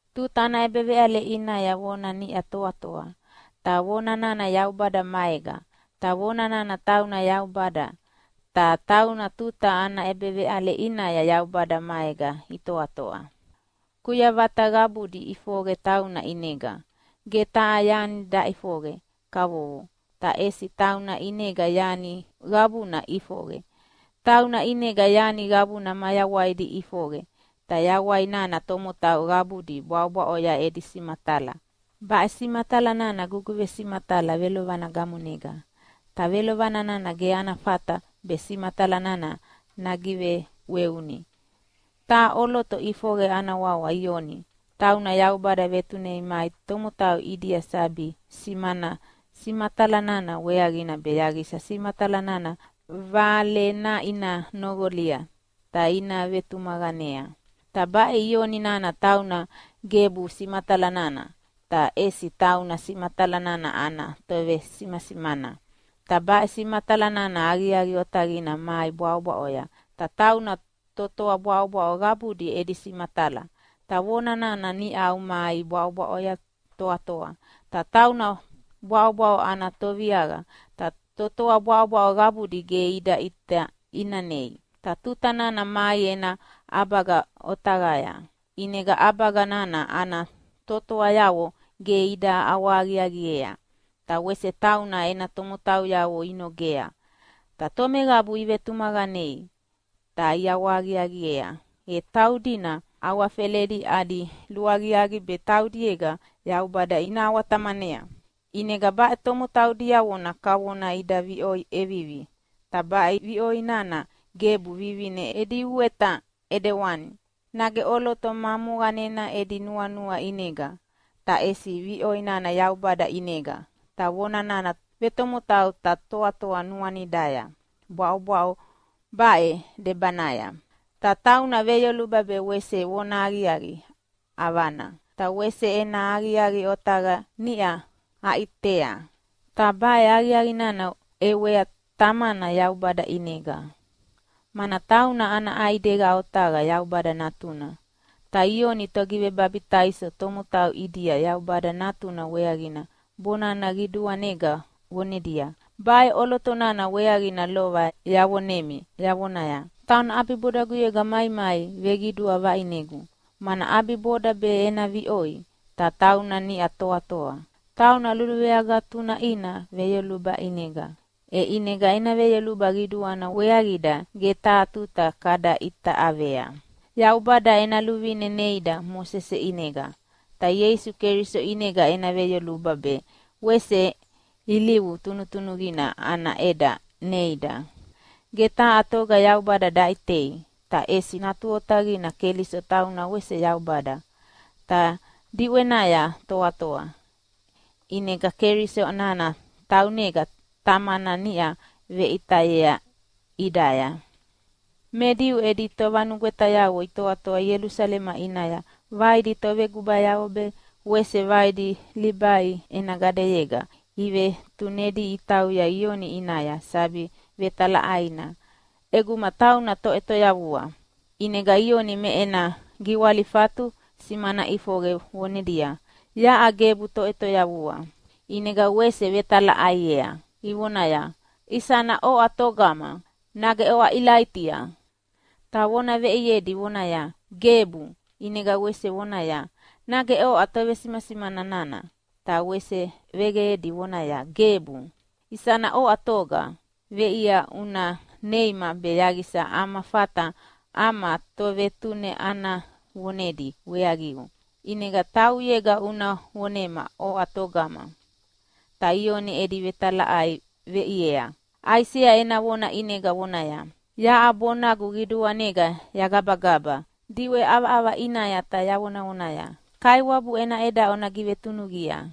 Tuta ana ʼebeveʼale ʼinaya Vona niʼa toatoa, ta Vona nana Yaubada maega, ta Vona nana tauna Yaubada. Ta tauna tuta ana ʼebeveʼale ʼinaya Yaubada maega itoatoa. Kuyavata qabudi iʼifoqe tauna ʼinega. Ge taha yani daʼifoqe kavovo, ta ʼesi tauna ʼinega yani qabuna iʼifoqe. Tauna ʼinega yani qabuna mayawaidi iʼifoqe, ta yawai nana tomotau qabudi bwaʼobwaʼoya edi simatala. Baʼe simatala nana guguvesimatala velovana gamonega, ta velovana nana ge ana fata be simatala nana nagiveʼweuni. Taha ʼoloto ʼifoqe ana wawa Ioni, tauna Yaubada vetunei mai tomotau ʼidia sabi simana simatala nana weaqina be yaqisa simatala nana valena ina noqoli ta ina vetumaqanea. Ta baʼe Ioni nana tauna gebu simatala nana, ta ʼesi tauna simatala nana ana tovesimasimana. Ta baʼe simatala nana aqiaqi otaqina mai bwaʼobwaʼoya, ta tauna totoa bwaʼobwaʼo qabudi edi simatala. Ta Vona nana niʼau mai bwaʼobwaʼoya toatoa, ta tauna bwaʼobwaʼo ana Toviaqa, ta totoa bwaʼobwaʼo qabudi ge ida ʼita ʼinanei. Ta tuta nana mai ena ʼabaga otaqaya, ʼinega ʼabaga nana ana totoayavo ge ida ʼawahaqiaqiea, ta wese tauna ena tomotauyavo inogea. Ta tomeqabu ivetumaqanea ta iʼawahaqiaqiea, e taudina awafeledi adi luaqiaqi be taudiega Yaubada ina ʼawa-Tamanea. ʼInega baʼe tomotau diavona kavona ida viʼoi ʼevivi. Ta baʼe viʼoi nana gebu vivine edi uweta ʼidewani, nage ʼoloto ma moqanena edi nuanua ʼinega, ta ʼesi viʼoi nana Yaubada ʼinega. Ta Vona nana vetomotau ta toatoa nuanidaya bwaʼobawaʼo baʼe debanaya. Ta tauna veyoluba be wese vonahaqiaqi ʼavana, ta wese ena aqiaqi otaqa niʼa aʼitea, ta baʼe aqiaqi nana ʼewea Tamana Yaubada ʼinega, mana tauna ana ʼaidega otaqa Yaubada Natuna. Ta Ioni Togivebabitaiso tomotau ʼidia Yaubada Natuna weaqina bonana qiduanega vonedia, “Baʼe ʼoloto nana weaqina lova yavonemi yavonaya, ‘Tauna ʼabibodaguyega maimai veqidua vaʼinegu, mana ʼabiboda be ena viʼoi, ta tauna niʼa toatoa.’” Tauna luluveagatunaʼina veyoluba ʼinega, e ʼinega ena veyoluba qiduana weaqida ge taha tuta kada ʼita ʼavea. Yaubada ena luvine neida Mosese ʼinega, ta Ieisu Keliso ʼinega ena veyoluba be wese ilivu tunutunuqina ana ʼeda neida. Ge taha toga Yaubada daʼitei, ta ʼesi Natu Otaqina Keliso tauna wese Yaubada, ta diʼwenaya toatoa, ʼinega Keliso nana taunega Tamana niʼa veʼitayea ʼidaya. Me Diu edi tovanugwetayavo itoatoa Ielusalema ʼinaya vaidi tovegubayavo be wese vaidi Libai ena gadeyega ivetunedi itauya Ioni ʼinaya sabi vetalaʼaina ʼeguma tauna Toʼetoyavua. ʼInega Ioni me ena giwalifatu simana ʼifoqe vonedia, “Yaʼa gebu Toʼetoyavua.” ʼInega wese ivetalaʼaiea ivonaya, “Isana oʼa togama? Nage oʼa Ilaitia?” Ta vona veʼiedi vonaya, “Gebu!” ʼInega wese ivoneaya, “Nage oʼa tovesimasimana nana?” Ta wese vegeqedi vonaya, “Gebu!” “Isana oʼa toga? Veʼia una neima be yaqisa ama fata ama tovetune ana vonedi weaqiu. ʼInega tauʼuyega una vonema oʼa togama!” Ta Ioni edi vetalaʼai veʼiea Aisea ena vona ʼinega vonaya, “Yaʼa bonagu qiduanega yagabagaba diʼwe ʼavaʼava ʼinaya ta yavonavonaya, ‘Kaiwabu ena ʼeda ona givetunuqia!’”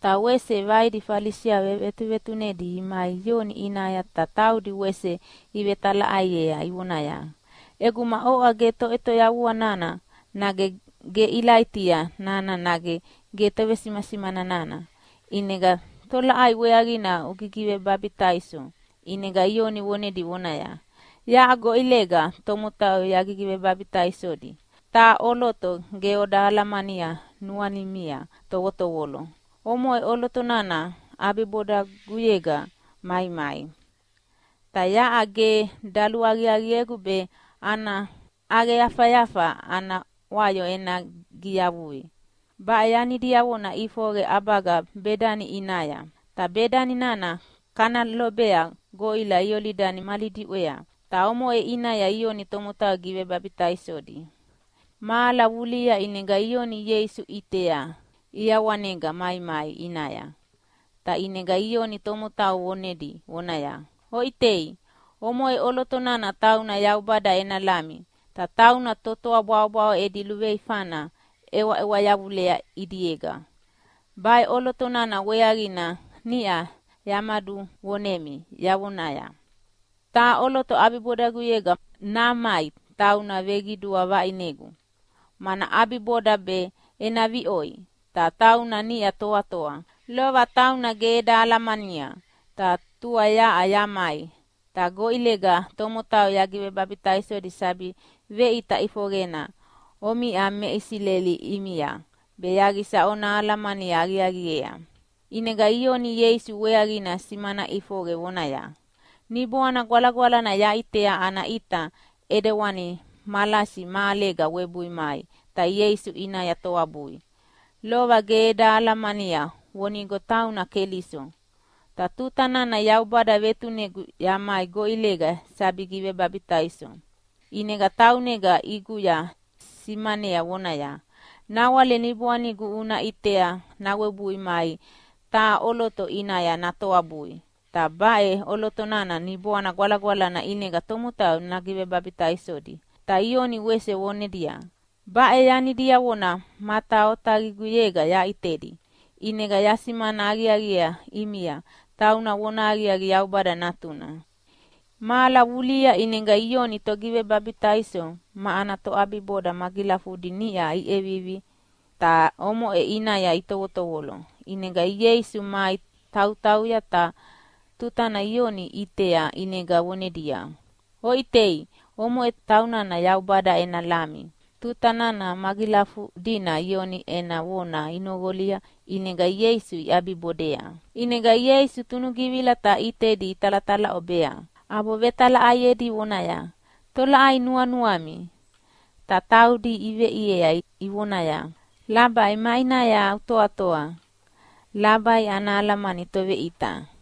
Ta wese vaidi Falisiavo vetuvetunedi imai Ioni ʼinaya ta taudi wese ivetalaʼaiea, ivonaya, “ʼEguma oʼa ge Toʼetoyavua nana nage ge Ilaitia nana nage ge Tovesimasimana nana, ʼinega tolaʼai weaqina ugigivebabitaiso?” ʼInega Ioni vonedi vonaya, “Yaʼa goʼilega tomotau yagigivebabitaisodi, ta taha ʼoloto ge oda alamania nuanimia tovotovolo. Omoʼe ʼoloto nana ʼabibodaguyega maimai, ta yaʼa ge daluaqiaqiegu be ana ʼaqeyafayafa ana wayo ena giyavui.” Baʼe yani diavona ʼifoqe ʼabaga Bedani ʼinaya, ta Bedani nana kana lobea goʼila Iolidani mali diʼwea. Ta omoʼe ʼinaya Ioni tomotau gigivebabitaisodi. Mahala vulihia ʼinega Ioni Ieisu ʼitea ʼiawanega maimai ʼinaya, ta ʼinega Ioni tomotau vonedi vonaya, “Oʼitei, omoʼe ʼoloto nana tauna Yaubada ena Lami, ta tauna totoa bwaʼobwaʼo edi luveifana ʼewaʼewa yavulea ʼidiega. Baʼe ʼoloto nana weaqina niʼa yamaduvonemi yavonaya, ‘Taha ʼoloto ʼabibodaguyega namai tauna veqidua vaʼinegu, mana ʼabiboda be ena viʼoi, ta tauna niʼa toatoa.’ Lova tauna ge eda alamania, ta tua yaʼa yamai ta goʼilega tomotau yagivebabitaisodi sabi veʼita ʼifoqena omiʼa me Isileli ʼimia be yaqisa ona alamani aqiaqiea.” ʼInega Ioni Ieisu weaqina simana ʼifoqe vonaya, “Niboana Gwalagwalana yaʼitea ana ʼita ʼidewani malasi mahalega webui mai ta Ieisu ʼinaya toabui. Lova ge eda alamania vonigo tauna Keliso. Ta tuta nana Yaubada vetunegu yamai goʼilega sabi givebabitaiso, ʼinega taunega ʼiguya simanayea vonaya, ‘Nawale Niboanigu una ʼitea nawebui mai taha ʼoloto ʼinaya natoabui, ta baʼe ʼoloto nana Niboana Gwalagwalana ʼinega tomotau nagivebabitaisodi.’” Ta Ioni wese vonedia, “Baʼe yani diavona mata otaqiguyega yaʼitedi, ʼinega yasimasimana aqiaqi ʼimia tauna vonahaqiaqi Yaubada Natuna.” Mahala vulihia ʼinega Ioni Togivebabitaiso ma ana toʼabiboda magilafudi niʼa iʼevivi ta omoʼe ʼinaya itovotovolo. ʼInega Ieisu mai tautauya, ta tutana Ioni ʼitea ʼinega vonedia, “Oʼitei, omoʼe taunana Yaubada ena Lami.” Ta tuta nana magilafudina Ioni ena vona inoqolia ʼinega Ieisu iʼabibodea. ʼInega Ieisu tunugivila ta ʼitedi italatalaʼobea, ʼabo vetalaʼaiedi vonaya, “Tolaʼai nuanuami?” Ta taudi iveʼiea ivonaya, “Labai, maʼinaya utoatoa?” (Labai ana alamani Toveʼita).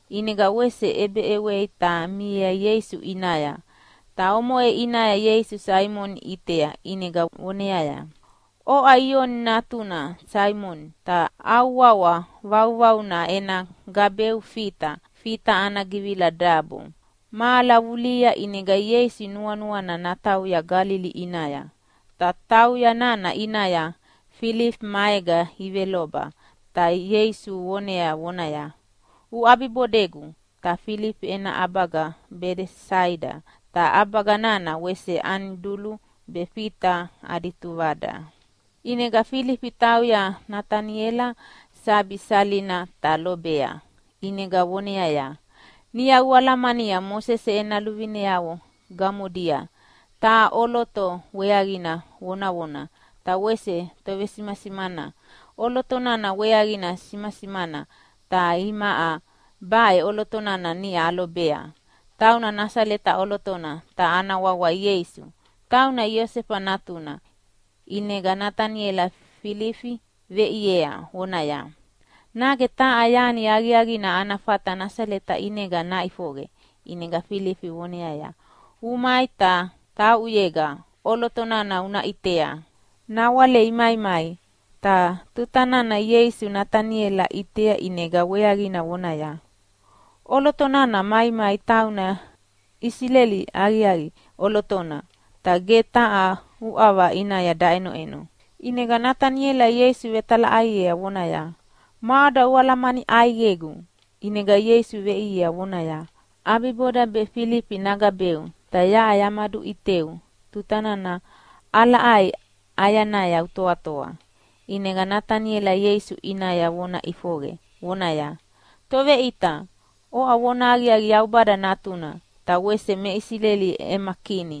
ʼInega wese ʼebeʼewei ta miea Ieisu ʼinaya, ta omoʼe ʼinaya Ieisu Saimoni ʼitea, ʼinega voneaya, “Oʼa Ioni natuna Saimoni, ta au wawa vauvauna ena gabeu Fita.” (Fita ana givila Dabo.) Mahala vulihia ʼinega Ieisu nuanuana natauya Galili ʼinaya. Ta tauya nana ʼinaya Filifi maega iveloba, ta Ieisu vonea vonaya, “Uʼabibodegu!” Ta Filifi ena ʼabaga Bedesaida, ta ʼabaga nana wese Anidulu be Fita adi tuvada. ʼInega Filifi tauya Nataniela sabi salina ta lobea, ʼinega voneaya, “Niʼa ualamania Mosese ena luvineavo gamodia taha ʼoloto weaqina vonavona, ta wese tovesimasimana ʼoloto nana weaqina isimasimana. Ta imaʼa baʼe ʼoloto nana niʼa alobea, tauna Nasaleta ʼolotona, ta ana wawa Ieisu, tauna Iosefa natuna.” ʼInega Nataniela Filifi veʼiea vonaya, “Nage taha yani aqiaqina ana fata Nasaleta ʼinega naʼifoqe?” ʼInega Filifi voneaya, “Umai, ta tauʼuyega ʼoloto nana una ʼitea.” Nawale imaimai, ta tuta nana Ieisu Nataniela ʼitea ʼinega weaqina vonaya, “ʼOloto nana maimai tauna Isileli aqiaqi ʼolotona, ta ge taha uʼava ʼinaya daʼenoʼeno.” ʼInega Nataniela Ieisu vetalaʼaiea vonaya, “Maʼoda ualamani ʼaiqegu?” ʼInega Ieisu veʼiea vonaya, “ʼAbiboda be Filifi nagabeu, ta yaʼa yamaduʼiteu tuta nana ʼalaʼai ʼayanaya utoatoa.” ʼInega Nataniela Ieisu ʼinaya vona ʼifoqe, vonaya, “Toveʼita, oʼa vonahaqiaqi Yaubada Natuna, ta wese me Isileli ema Kini.”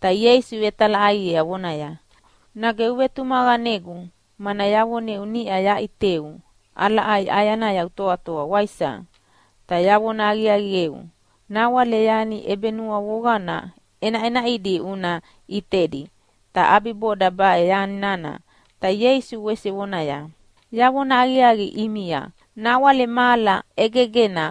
Ta Ieisu vetalaʼaiea vonaya, “Nage uvetumaqanegu mana yavoneu niʼa yaʼiteu ʼalaʼai ʼayanaya utoatoa, waisa? Ta yavona aqiaqieu, nawale yani ʼebenuavoqana ʼenaʼenaʼidi una ʼitedi, ta ʼabiboda baʼe yani nana.” Ta Ieisu wese vonaya, “Yavona aqiaqi ʼimia, nawale mahala ʼegegena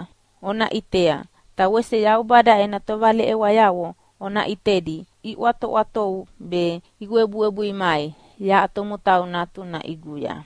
ona ʼitea, ta wese Yaubada ena tovaleʼewayavo ona ʼitedi iʼwatoʼwatovu be iwebuwebui mai yaʼa Tomotau Natuna ʼiguya.”